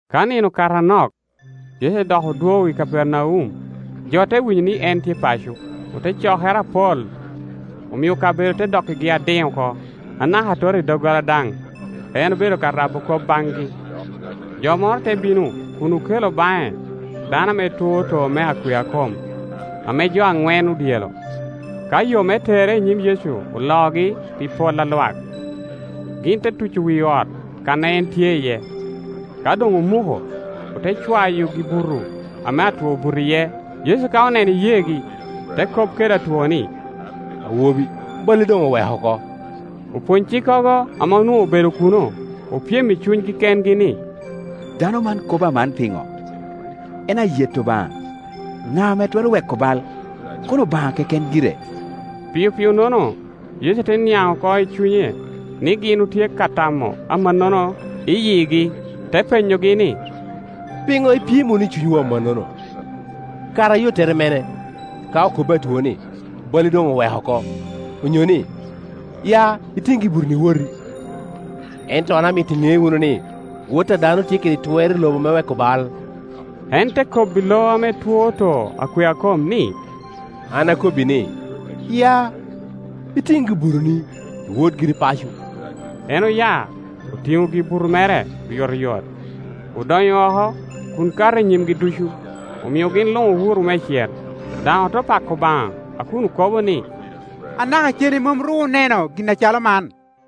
Ka nino okato anok, Yecu dok odwogo i Kapernaum, jo te winyo ni en tye paco. Ote cokere apol, omio kabedo te dokkigi adiŋ oko, anaka atot i doggola daŋ; en obedo ka rabo kop baŋgi. Jo moro te bino kun okelo baŋe dano ame two too me akwea kom, ame jo aŋwen odyelo. Ka yo me tere i nyim Yecu oloogi pi pol a lwak, gin te tuco wi ot kan a en tye iye; ka doŋ omuko, ote cwayo gi-buto ame atwo obuto iye. Yecu ka oneno iyeegi, te kop kede atwo ni, “Awobi, balli doŋ oweko oko.” Opwony-cikkogo ame onwoŋo obedo kuno opyem i cunygi kengi ni, “Dano man kobo aman piŋo? En ayeto Obaŋa! Ŋa ame twero weko bal, kono Obaŋa keken gire?” Piopio-nono Yecu te niaŋ oko i cunye ni gin otye ka tamo amannono i yigi, te penyogi ni, “Piŋo ipyem wunu i cunywu amannono? Kara ayottere mene, ka okobbi atwo ni, ‘Balli doŋ oweko oko’, onyo ni, ‘Ya, itiŋ gibutoni, iwoti?’ Ento an amito iŋe wunu ni, Wot a dano tye kede twer i lobo me weko bal.” En te kobbi lo ame two too akwea kom ni, “An akobbi ni, ya, itiŋ gi-butoni, iwot giri paco.” En oya, otiŋo gi-buto mere oyotoyot, odonyo oko kun kato i nyimgi ducu, omio gin luŋ owuro meicel, daŋ ote pako Obaŋa a kun okobo ni, “Anaka cene mom ru oneno gin acalo man.”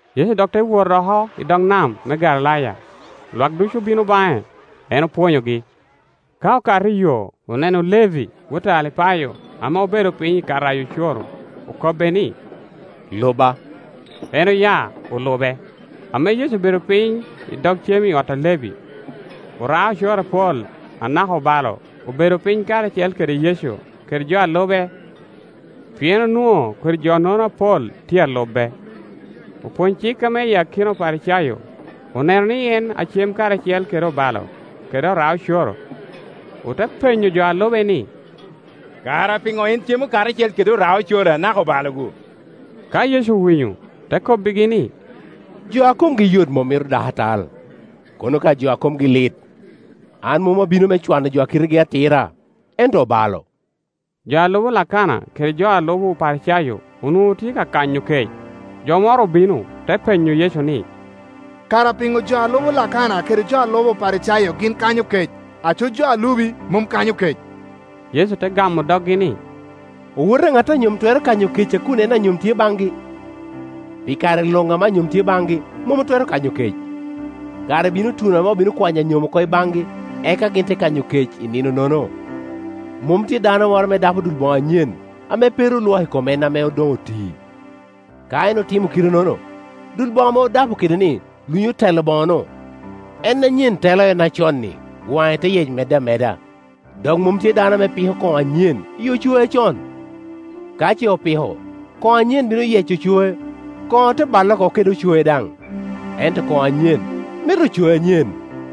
Yecu dok te wot oko i dog nam me Galilaya; lwak ducu obino baŋe, en opwonyogi. Ka okato iyo, oneno Levi, wot a Alipayo ame obedo piny i ka rayo ocoro; okobbe ni, “Luba,” En oya, olube. Ame Yecu obedo piny i dog cem i ot a Levi, ora-ocoro apol anaka obalo obedo piny karacel kede Yecu kede jo a lube, pien onwoŋo kodi jo-nono apol tye a lube. Opwony cik ame i akina Oparicayo oneno ni en acem karacel kede obalo kede oraocoro, ote penyo jo a lube ni, “Kara piŋo en cemo karacel kede ora-ocoro anaka obalo-gu?” Ka Yecu owinyo, te kobbigi ni, “lo a komgi yot mom mito dakatal, kono ka jo a komgi lit. An mom abino me cwano jo a kitegi atira, ento obalo.” Jo a lubo Lakana kede jo a lubo Oparicayo onwoŋo otye ka kanyo kec; jo moro obino, te penyo Yecu ni, “Kara piŋo jo a lubo Lakana kede jo a lubo Oparicayo gin kanyo kec, aco jo a lubi mom kanyo kec?” Yecu te gamo doggi ni, “Owote a ŋat a nyom twero kanyo kec a kun en anyom tye baŋgi? Pi kare luŋ ame anyom tye baŋgi mom otwero kanyo kec. Kare bino tuno ame obino kwanyo anyom oko i baŋgi, eka gin te kanyo kec i ninonono. Mom tye dano moro ame dapo dul boŋo anyen, ame pe ru olwoko, i kom en ame doŋ oti. Ka en otimo kite-nono, dul boŋo ame odapo kede-ni lunyo telo boŋe-nu, en anyen telo en aconni, waŋe te yec medde ameda. Dok mom tye dano ame piko koŋo anyen i ocoe acon; ka ce opiko, koŋo anyen bino yeco ocoe, koŋo te balle oko kede ocoe daŋ; ento koŋo anyen mito ocoe anyen.”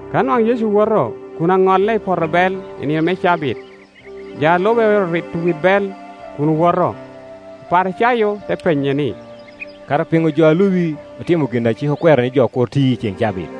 Ka nwaŋ Yecu woto kun aŋolle i poto bel i nino me cabit, jo a lube oero rito wit bel kun owoto. Oparicayo te penye ni, “Kara piŋo jo a lubi otimo gin ame cik okwero ni jo kur ti i ceŋ cabit?”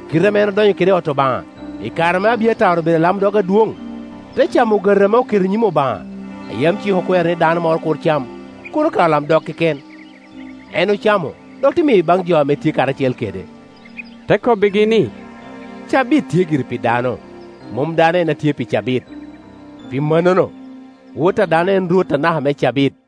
Kite ame en odonyo kede i ot Obaŋa, i kare ame Abiatar obedo alamdog adwoŋ, te camo ogati ame oketo i nyim Obaŋa, a yam cik okwero ni dano moro kur cam, kono ka olamdog keken? En ocamo dok te miyo baŋ jo ame tye karacel kede.” Te kobbigi ni, “Cabit tye gire pi dano, mom dano en a tye pi cabit. Pi mannono, Wot a dano en rwot anaka me cabit.”